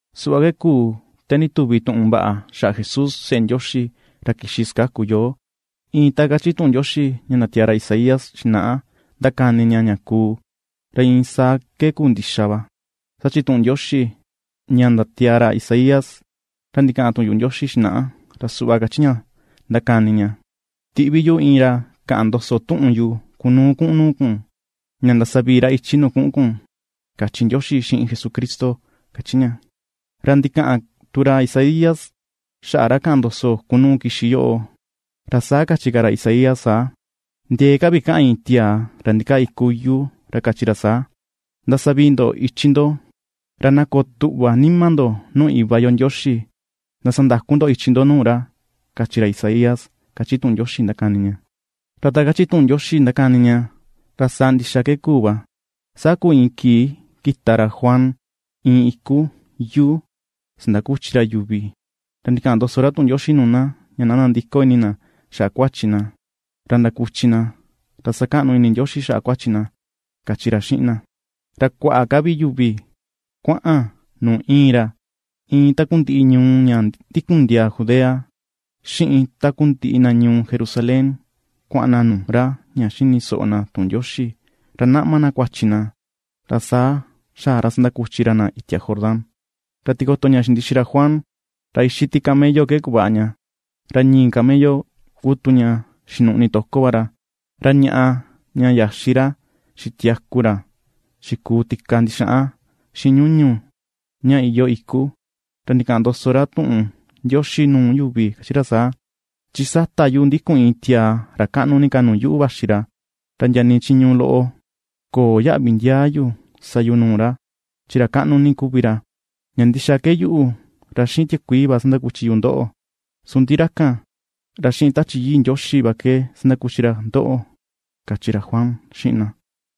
Suꞌva ke kuu te ndituvi tuꞌun vaꞌa xaꞌa Jesús, seꞌe Ndioxi, ra kixi sakaku yo. Iin ta kachi tuꞌun Ndioxi, ña ndatiaa ra Isaías xinaꞌa, ndakani ña xaꞌa ña kuu, ra iin saa ke kuu ndixa va. Saa chi tuꞌun Ndioxi, ña ndatiaa ra Isaías ra ndikaꞌan tuꞌun yuꞌu Ndioxi xinaꞌa, ra suꞌva kachi ña ndakani ña: “Tiꞌvi yu iin ra kaꞌan ndoso tuꞌun yu kunuu kuꞌun nuu kun, ña ndasavii ra ichi nuu kuꞌun kun”, kachi Ndioxi xiꞌin Jesucristo kachi ña. Ra ndikaꞌan tu ra Isaías xaꞌa ra kaꞌan ndoso, kunuu kixi yoꞌo, ra saa kachi ka ra saa: Ndiee ka vi kaꞌan iin tiaa ra ndikaa iku yuu ra kachi ra saa: “Ndasavii ndo ichi ndo, ra na koo tuꞌva nima ndo nuu Iva yo Ndioxi. Ndasandaku ndo ichi ndo nuu ra”, kachi ra Isaías, kachi tuꞌun Ndioxi ndakani ña. Ra ta kachi tuꞌun Ndioxi ndakani ña, ra saa ndixa ke kuu va: saa kuu iin kii kita ra Juan iin iku yuu sakuchi ra yuvi, ra ndikaꞌan ndoso ra tuꞌun Ndioxi nuu na, ña na ndandiko ini na xaꞌa kuachi na, ra ndakuchi na, ra sakaꞌnu ini Ndioxi xaꞌa kuachi na kachi ra xiꞌin na. Ra kuaꞌa ka vi yuvi kuaꞌan nuu iin ra, iin takundiꞌi na ñuu ña ndikun ndiaa Judea, xiꞌin takundiꞌi na ñuu Jerusalén, kuaꞌan na nuu ra ña xini soꞌo na tuꞌun Ndioxi, ra naꞌma na kuachi na, ra saa xaꞌa ra sakuchi ra na itia Jordán. Ra tikoto ña xindixi ra Juan, ra ixi ti camello ke kuvaꞌa ña, ra ñii camello ku tu ña xinuꞌni toko va ra, ra ñaꞌa ña yaxi ra xitiaku ra xikuu ti̱ka ndixaꞌan xiꞌin ñuñu ña iyoo iku. Ra ndikaꞌan ndoso ra tuꞌun Ndioxi nuu yuvi, kachi ra saa: ―Chi sata yuꞌu ndikun iin tiaa ra kaꞌnu ni ka nuu yuꞌu vaxi ra, ra ndia nii chiñu loꞌo köo yaꞌvi ndiaa yu sa yu nuu ra, chi ra kaꞌnu ni kuvi ra. Ña ndixa ke yuꞌu, ra xiꞌin tiakuii va sakuchi yu ndoꞌo, su ndi ra kan, ra xiꞌin Tachi Yii Ndioxi va ke sakuchi ra ndoꞌo ―kachi ra Juan xiꞌin na.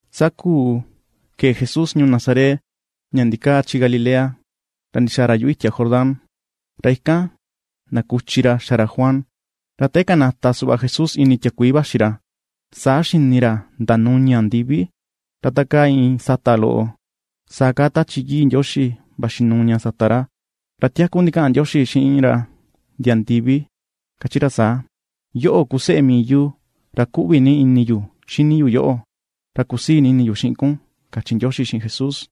Saa kuu kee Jesús ñuu Nazaret ña ndikaa chi Galilea ra ndixaa ra yuꞌu itia Jordán, ra ikan kuchi ra xa ra Juan. Ra te kanata suꞌva Jesús ini tiakuii vaxi ra, saa xini ra ndanuña ndivi, ra ta kaa iin sata loꞌo, saa kaa Tachi Yii Ndioxi vaxi nuu ña sata ra. Ra tiaku ndikaꞌan Ndioxi xiꞌin ra ndia ndivi, kachi ra saa: ―Yoꞌo ku Seꞌe mii yu ra kuꞌvi ni ini yu xini yu yoꞌo. Ra kusii ni ini yu xiꞌin kun, ―kachi Ndioxi xiꞌin Jesús.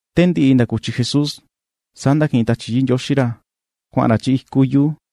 Te ndiꞌi kuchi Jesús, saa ndakiꞌin Tachi Yii Ndioxi ra, kuaꞌan ra chi iku yuu.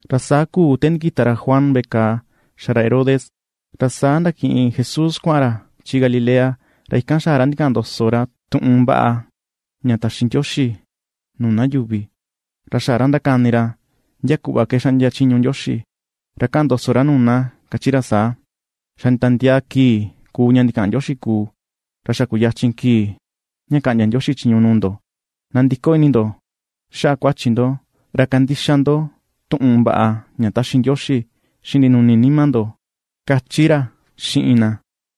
Ra saa kuu te ndikita ra Juan veꞌe kàà xa ra Herodes, ra saa ndakiꞌin Jesús kuaꞌan ra chi Galilea. Ra ikan xaꞌa ra ndikaꞌan ndoso ra tuꞌun vaꞌa ña taxi Ndioxi nuu na yuvi, ra xaꞌa ra ndakani ra ndia kuꞌva ke xaꞌndia chiñu Ndioxi. Ra kaꞌan ndoso ra nuu na kachi ra saa: ―Xa nditiandiaa kii kuu ña ndikaꞌan Ndioxi kuu, ra xa kuyachin kii ña kaꞌndia Ndioxi chiñu nuu ndo; nandiko ini ndo xaꞌa kuachi ndo, ra kandixa ndo tuꞌun vaꞌa ña taxi Ndioxi xiꞌin ndinuni nima ndo ―kachi ra xiꞌin na.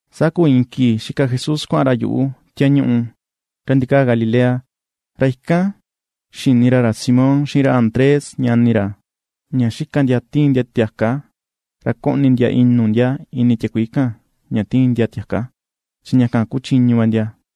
Saa kuu iin kii xika Jesús kuaꞌan ra yuꞌu tiañuꞌu ra ndikaa Galilea, ra ikan xini ra ra Simón xiꞌin ra Andrés ñani ra, ña xika ndia tiin ndia tiaka, ra koꞌni ndia inu ndia ini tiakuii kan ña tiin ndia tiaka. Chi ña kan ku chiñu va ndia.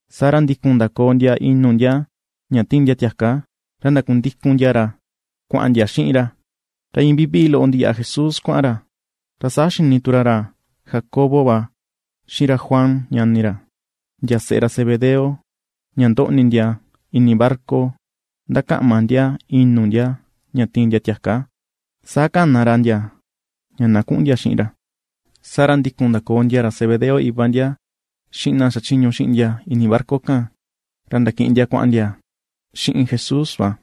Saa ra ndikun ndakoo ndia inu ndia ña tiin ndia tiaka, ra ndakundikun ndia ra kuaꞌan ndia xiꞌin va ra. Ra iin vivii loꞌo ndiyaꞌa Jesús kuaꞌan ra, saa ra xini tu ra ra Jacobo va xiꞌin ra Juan, ñani ra, ndia seꞌe ra Zebedeo ña ndoꞌni ndia ini barca ndakaꞌma ndia inu ndia ña tiin ndia tiaka. Saa kana ra ndia, ña na kuꞌun ndia xiꞌin ra. Saa ra ndikun ndakoo ndia ra Zebedeo, iva ndia, xiꞌin ndia xachiñu xiꞌin ndia ini barca kan, ra ndakiꞌin ndia kuaꞌan ndia xiꞌin Jesús va.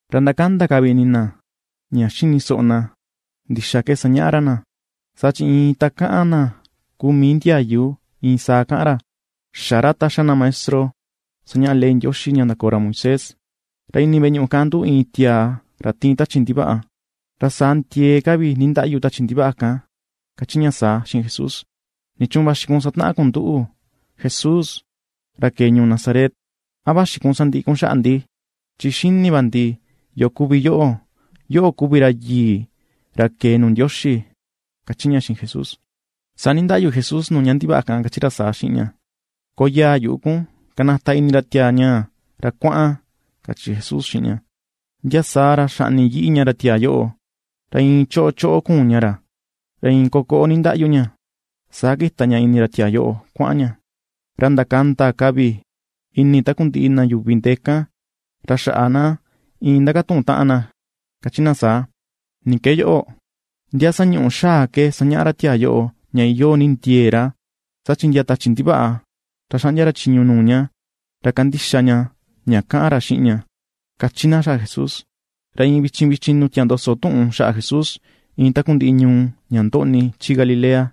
Ra ndakanda ka vi ini na ña xini soꞌo na kuꞌva ke sañaꞌa ra na, saa chi iin ta kaꞌan na kuu mii ndiayu iin saa kaꞌan ra; xä ra ta xa na maestro sañaꞌa ley Ndioxi ña ndakoo ra Moisés. Ra ini veꞌe ñuꞌu kan nduꞌu iin tiaa ra tiin tachi ndivaꞌa, ra saa ndiee ka vi nindaꞌyu tachi ndivaꞌa kan kachi ña saa xiꞌin Jesús: ―¿Nichuun vaxi kun sataꞌan kun nduꞌu, Jesús, ra kee ñuu Nazaret? ¿A vaxi kun sandiꞌi kun xaꞌa ndi? Chi xini va ndi yo kuvi yoꞌo: Yoꞌo kuvi ra yii, ra kee nuu Ndioxi ―kachi ña xiꞌin Jesús. Saa nindaꞌyu Jesús nuu ña ndivaꞌa kan, kachi ra saa xiꞌin ña: ―¡Koyaa yuꞌu kun! ¡Kanata ini ra tiaa ñaa, ra kuaꞌan! ―kachi Jesús xiꞌin ña. Ndia saa ra xaꞌni yiꞌi ña ra tiaa yoꞌo, ra iin cho choꞌo kuun ña ra, ra iin kokoꞌo nindaꞌyu ña, saa kita ña ini ra tiaa yoꞌo, kuaꞌan ña. Ra ndakanda ka vi ini takundiꞌi na yuvi ndee kan, ra xaꞌa na iin ndakatuꞌun taꞌan na kachi na saa: ―¿Ni ke yoꞌo? ¿Ndia sañuꞌu xaa ke sañaꞌa ra tiaa yoꞌo, ña iyoo ni ndiee ra, saa chi ndia tachi ndivaꞌa, ra xaꞌndia ra chiñu nuu ña, ra kandixa ña ña kaꞌan ra xiꞌin ña? ―kachi na xaꞌa Jesús. Ra iin vichin vichin ndindutia ndoso tuꞌun xaꞌa Jesús iin takundiꞌi ñuu ña ndoꞌni chi Galilea.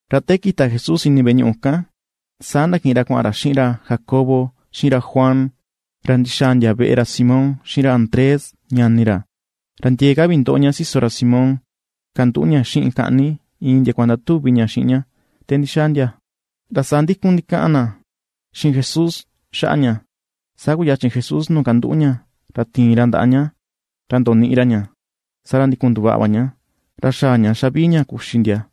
Ra te kita Jesús ini veꞌe ñuꞌu kan, saa ndakiꞌin ra kuaꞌan ra xiꞌin ra Jacobo, xiꞌin ra Juan, ra ndixaa ndia veꞌe ra Simón xiꞌin ra Andrés ñani ra. Ra ndiee ka vi ndoꞌo ña siso ra Simón kanduꞌu ña xiꞌin kaꞌni, iin ndiakua ndatuvi ña xiꞌin ña te ndixaa ndia. Ra saa ndikun ndikaꞌan na xiꞌin Jesús xaꞌa ña. Saa kuyachin Jesús nuu kanduꞌu ña, ra tiin ra ndaꞌa ña, ra ndoniꞌi ra ña, saa ra ndikun nduvaꞌa va ña, ra xaꞌa ña xavii ña kuxi ndia.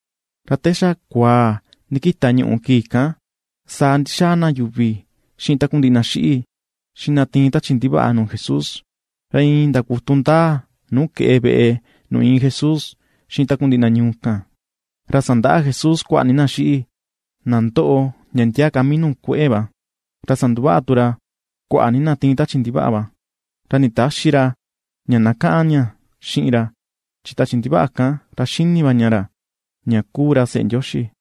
Ra te xa kuaa ndikita ñuꞌù kii kan, saa ndi̱xaa na yuvi xiꞌin takundiꞌi na xiꞌi, xiꞌin na tiin tachi ndivaꞌa nuu Jesús. Ra iin ndakutu ndaa nuu keꞌe veꞌe nuu iin Jesús xiꞌin takundiꞌi na ñuu kan. Ra sandaꞌa Jesús kuaꞌa ni na xiꞌi, na ndoꞌo ndia ndia ka mii nuu kueꞌe va. Ra sanduvaꞌa tu ra kuaꞌa ni na tiin tachi ndivaꞌa va. Ra nditäxi ra ña na kaꞌan ña xiꞌin ra, chin tachi ndivaꞌa kan, ra xini va ña ra, ña kuu ra Seꞌe Ndioxi.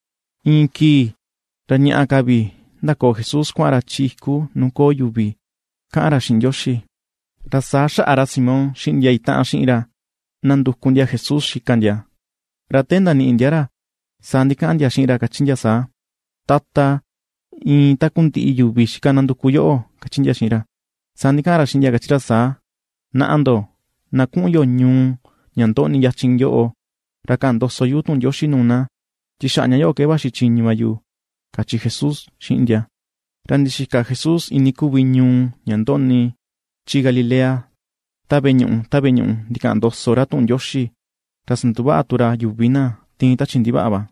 Iin kii, ra ñaꞌa ka vi ndakoò Jesús kuaꞌan ra chi iku nuu köo yuvi, kaꞌan ra xiꞌin Ndioxi. Ra saa xaꞌa ra Simón xiꞌin ndia itaꞌan xiꞌin ra nanduku ndia Jesús xika ndia. Ra te ndaniꞌi ndia ra, saa ndikaꞌan ndia xiꞌin ra kachi ndia saa: ―Tata, iin takundiꞌi yuvi xika ndanduku yoꞌo ―kachi ndia xiꞌin ra. Saa ndikaꞌan ra xiꞌin ndia kachi ra saa: ―Naꞌa ndo, na kuꞌun yo ñuu ña ndoꞌni yachin yoꞌo, ra kaꞌan ndoso yu tuꞌun Ndioxi nuu na, chi xaꞌa ña yoꞌo ke vaxi chiñu va yu ―kachi Jesús xiꞌin ndia. Ra ndixika Jesús iinii kuvi ñuu ña ndoꞌni chi Galilea ta veꞌe ñuꞌu ta veꞌe ñuꞌu, ndikaꞌan ndoso ra tuꞌun Ndioxi, ra sanduvaꞌa tu ra yuvi na tiin tachi ndivaꞌa va.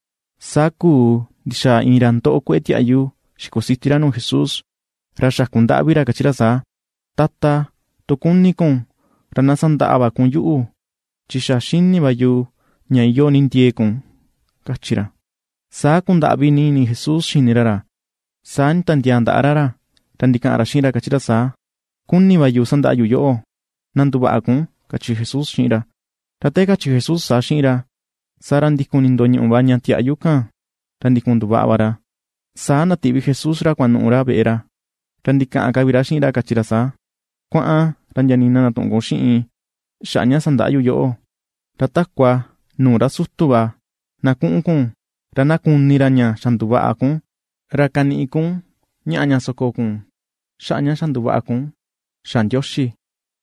Saa kuu ndixaa iin ra ndoꞌo kueꞌe tiaꞌyu, xikusiti ra nuu Jesús. Ra xakundaꞌvi ra kachi ra saa: ―Tata, tu kuni kun, ra na sandaꞌa va kun yuꞌu chi xa xini va yu ña iyoo ni ndiee kun ―kachi ra. Saa kundaꞌvi ni ini Jesús xini ra ra. Saa nditiandiaa ndaꞌa ra ra, ra ndikaꞌan ra xiꞌin ra kachi ra saa: ―Kuni va yu sandaꞌa yu yoꞌo, na nduvaꞌa kun ―kachi Jesús xiꞌin ra. Ra te kachi Jesús saa xiꞌin ra, saa ra ndikun nindoñuꞌu va ña tiaꞌyu kan, ra ndikun nduvaꞌa va ra. Saa ndatiꞌvi Jesús ra kuanuꞌu ra veꞌe ra. Ra ndikaꞌan ka vi ra xiꞌin ra kachi ra saa: ―Kuaꞌan, ra ndia nii na ndatüꞌun kun xiꞌin xaꞌa ña sandaꞌa yu yoꞌo. Ra takua nuu ra sutu va, na kuꞌun kun, ra na kuni ra ña xa nduvaꞌa kun, ra kaniꞌi kun ñaꞌa ña soko kun xaꞌa ña xa nduvaꞌa kun xa Ndioxi,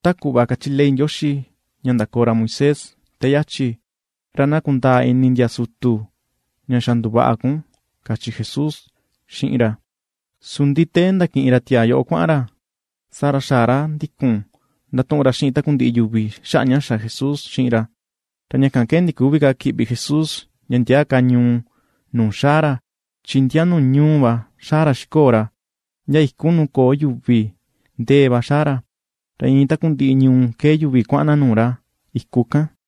ta kuꞌva kachi ley Ndioxi ña ndakoo ra Moisés te yachi; ra na kundaa ini ndia sutu ña xa nduvaꞌa kun ―kachi Jesús xiꞌin ra. Su ndi te ndakiꞌin ra tiaa yoꞌo kuaꞌan ra, saa ra xaꞌa ra ndikun ndatuꞌun ra xiꞌin takundiꞌi yuvi xaꞌa ña xa Jesús xiꞌin ra. Ra ña kan ke ndiküvi ka kiꞌvi Jesús ndia ndia ka ñuu nuu xaa ra, chi ndia nuu ñuu va xaa ra xikoo ra. Ndia iku nuu köo yuvi ndee va xaa ra. Ra iin takundiꞌi ñuu kee yuvi kuaꞌan na nuu ra, iku kan.